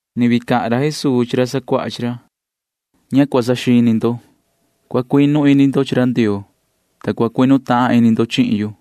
[Ni vii cahan ra Jesuu chi ra sacuaha chi ra:] ’Ña cua saxini ndo. Cua cuinu ini ndo chi ra Ndioo, ta cua cuinu tahan ini ndo chihin yu.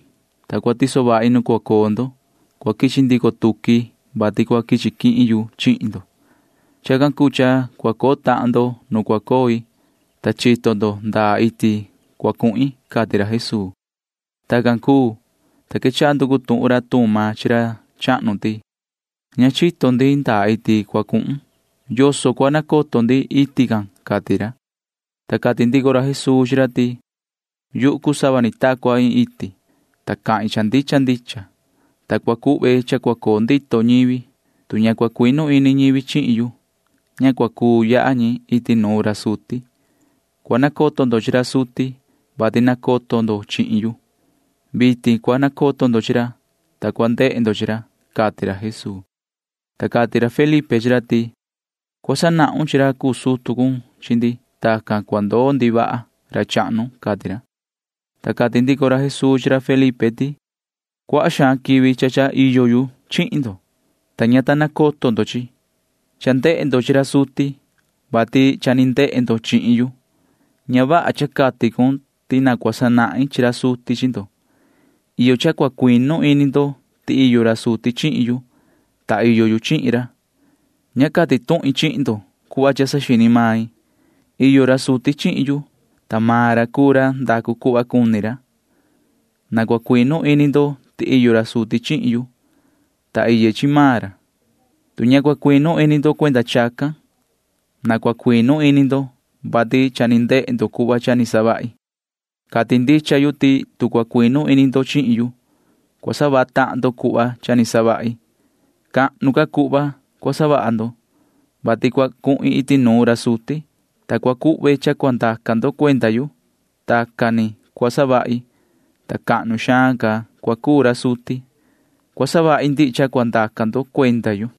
Tu cua cuhin, ta cua tiso vahi nu cua coo ndo, cua quichi ndico tuqui, vati cua quichi quihin yu chihin ndo. Chacan cuu cha cua coo tahan ndo nu cua coi, ta chito ndo ndaa iti cua cuhin ―cati ra Jesuu. Tacan cuu, ta quechaha nducu tuhun ra Tuma chi ra chahnu ti: ―Ña chito ndi ndaa iti cua cuhun. ¿Yoso cua nacoto ndi iti can? ―cati ra. Ta cati ndico ra Jesuu chi ra ti: ―Yuhu cuu sava ni ta cua iin iti, ta cahin cha ndicha ndicha, ta cua cuhve cha cua coo ndito ñivi. Tu ña cua cuinu ini ñivi chihin yu, ña cua cuu yaha ñi iti nuun ra suti. Cua nacoto ndo chi ra suti, vati nacoto ndo chihin yu. Vitin cua nacoto ndo chi ra, ta cua ndehe ndo chi ra ―cati ra Jesuu. Ta cati ra Felipe chi ra ti: ―Cua sanahun chi ra cuu sutu cun chi ndi. Tacan sa ndoo ndi vaha, ra chahnu ―cati ra. Ta cati ndico ra Jesuu chi ra Felipe ti: ―Cuaha quivi cha iyo ndo chihin yu, ta ña ta nacoto ndo chihin yu. Cha ndehe ndo chi ra suti, vati cha ni ndehe ndo chihin yu. Ña vaha cha cati cun ti na cua sanahin chi ra suti chi ndo. Iyo cha cua cuinu ini ndo ti cha iyo ra suti chihin yu, ta iyo yu chihin ra. Ña cati tuhin chihin ndo cuhva cha saxini main. Iyo ra suti chihin yu, ta maan ra cuu ra ndacu cuhva cuni ra. Na cua cuinu ini ndo ti iyo ra suti chihin yu, ta iye chi maan ra. Tu ña cua cuinu ini ndo cuenda chacan, na cua cuinu ini ndo, vati cha ni ndehe ndo cuhva cha ni savahi. Cati ndicha yu ti tu cua cuinu ini ndo chihin yu, cua savaha tahan ndo cuhva cha ni savahi. Cahnu ca cuhva cua savaha ndo, vati cua cuhin iti nuun ra suti, ta cua savahi ñaan cha cua ndaca ndo cuenda yu. Tacan ni cua savahi, ta cahnu xaan ca cua cuu ra suti. Cua savahi ndihi cha cua ndaca ndo cuenda yu.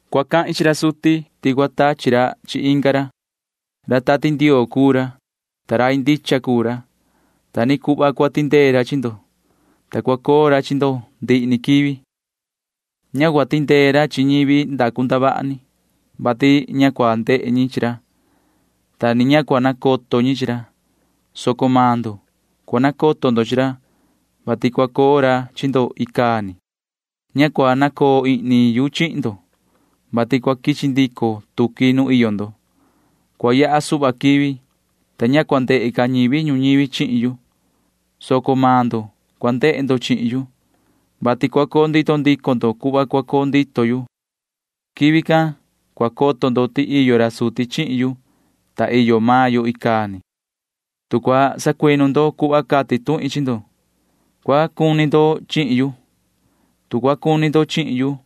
Cua cahin chi ra suti ti cua tachi ra chi inga ra. Ra Tati Ndioo cuu ra, ta rai ndicha cuu ra. Ta ni cuhva cua tindee ra chi ndo, ta cua coo ra chi ndo ndihi ni quivi. Ña cua tindee ra chi ñivi ndacu ndavaha ni, vati ña cua ndehe ñi chi ra, ta ni ña cua nacoto ñi chi ra, soco cua nacoto maan ndo chi ra, vati cua coo ra chi ndo icaa ni. Ña cua nacoo ihni yu chihin ndo, vati cua quichi ndico tuqui nu iyo ndo. Cua yaha suhva quivi, ta ña cua ndehe ca ñivi ñuñivi chihin yu, soco maan ndo cua ndehe ndo chihin yu, vati cua coo ndito ndico ndo cuhva cua coo ndito yu. Quivi can cua coto ndo ti iyo ra suti chihin yu, ta iyo maan yo icaa ni. Tu cua sacuinu ndo cuhva cati tuhin chi ndo, cua cuni ndo chihin yu. Tu cua cuni ndo chihin yu,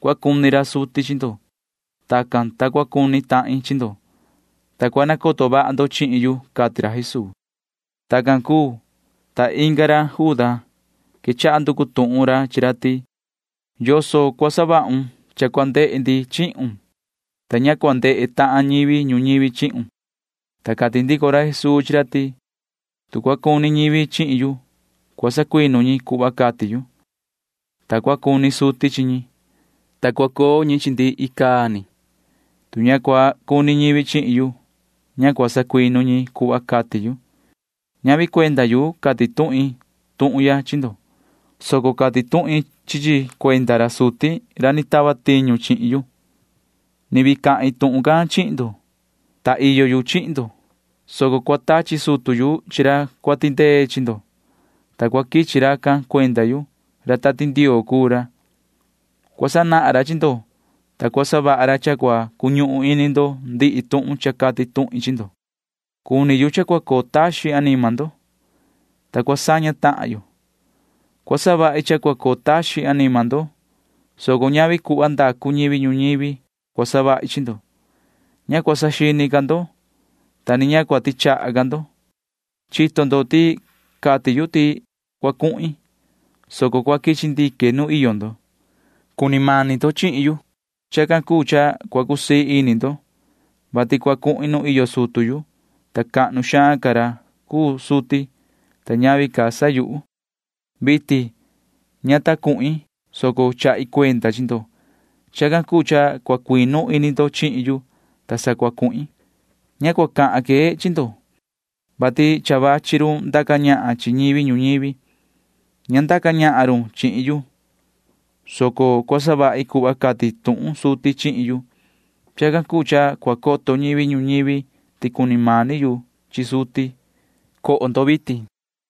cua cuni ra suti chi ndo. Tacan cua cuu, ta cua cuni tahin chi ndo, ta cua nacoto vaha ndo chihin yu ―cati ra Jesuu. Tacan cuu, ta inga ra Juda quechaha nducu tuhun chi ra ti: ―¿Yoso cua savahun cha cua ndehe ndi chihun, ta ña cua ndehe tahan ñivi ñuñivi chihun? Ta cati ndico ra Jesuu chi ra ti: ―Tu cua cuni ñivi chihin yu, cua sacuinu ñi cuhva cati yu, ta cua cuni suti chi ñi, ta cua coo ndi chi ñi. Tu ña cua cuni ñivi chihin yu, ña cua sacuinu ñi cuhva cati yu. Ñavi cuenda yu cati tuhin tuhun ya chi ndo, soco cati tuhin chi chi cuenda ra suti ra ni tava tiñu chihin yu. ’Ni vii cahin tuhun can chihin ndo, ta iyo yu chihin ndo, soco cua tachi sutu yu chi ra cua tindee chi ndo, ta cua quichi racan cuenda yu. Ra Tati Ndioo cuu ra. Cua sanahan ra chi ndo, ta cua savaha ra cha cua cuñuhun ini ndo ndihi tuhun cha cati tuhin chi ndo. ’Cuni yu cha cua coo taxin anima ndo, ta cua saña tahan yo. Cua savahi cha cua coo taxin anima ndo, soco ñavi cuhva ndacu ñivi ñuñivi cua savahi chi ndo. Ña cua saxini ca ndo, ta ni ña cua tichaha ca ndo. Chito ndo ti cati yu ti cua cuhin, soco cua quichi ndique nu iyo ndo. Cuni mani ndo chihin yu. Chacan cuu cha cua cusii ini ndo, vati cua cuhin nu iyo sutu yu, ta cahnu xaan ca ra cuu suti, ta ñavi ca sa yuhu. Vitin ña ta cuhin, soco chahi cuenda chi ndo. Chacan cuu cha cua cuinu ini ndo chihin yu, ta sa cua cuhin. ’Ña cua cahan que chi ndo, vati ni vachi run ndaca ñahan chi ñivi ñuñivi. Ña ndaca ñahan run chihin yu, soco cua savahi cuhva cati tuhun suti chihin yu. Chacan cuu cha cua coto ñivi ñuñivi ti cuni mani yu chi suti. Coho vitin.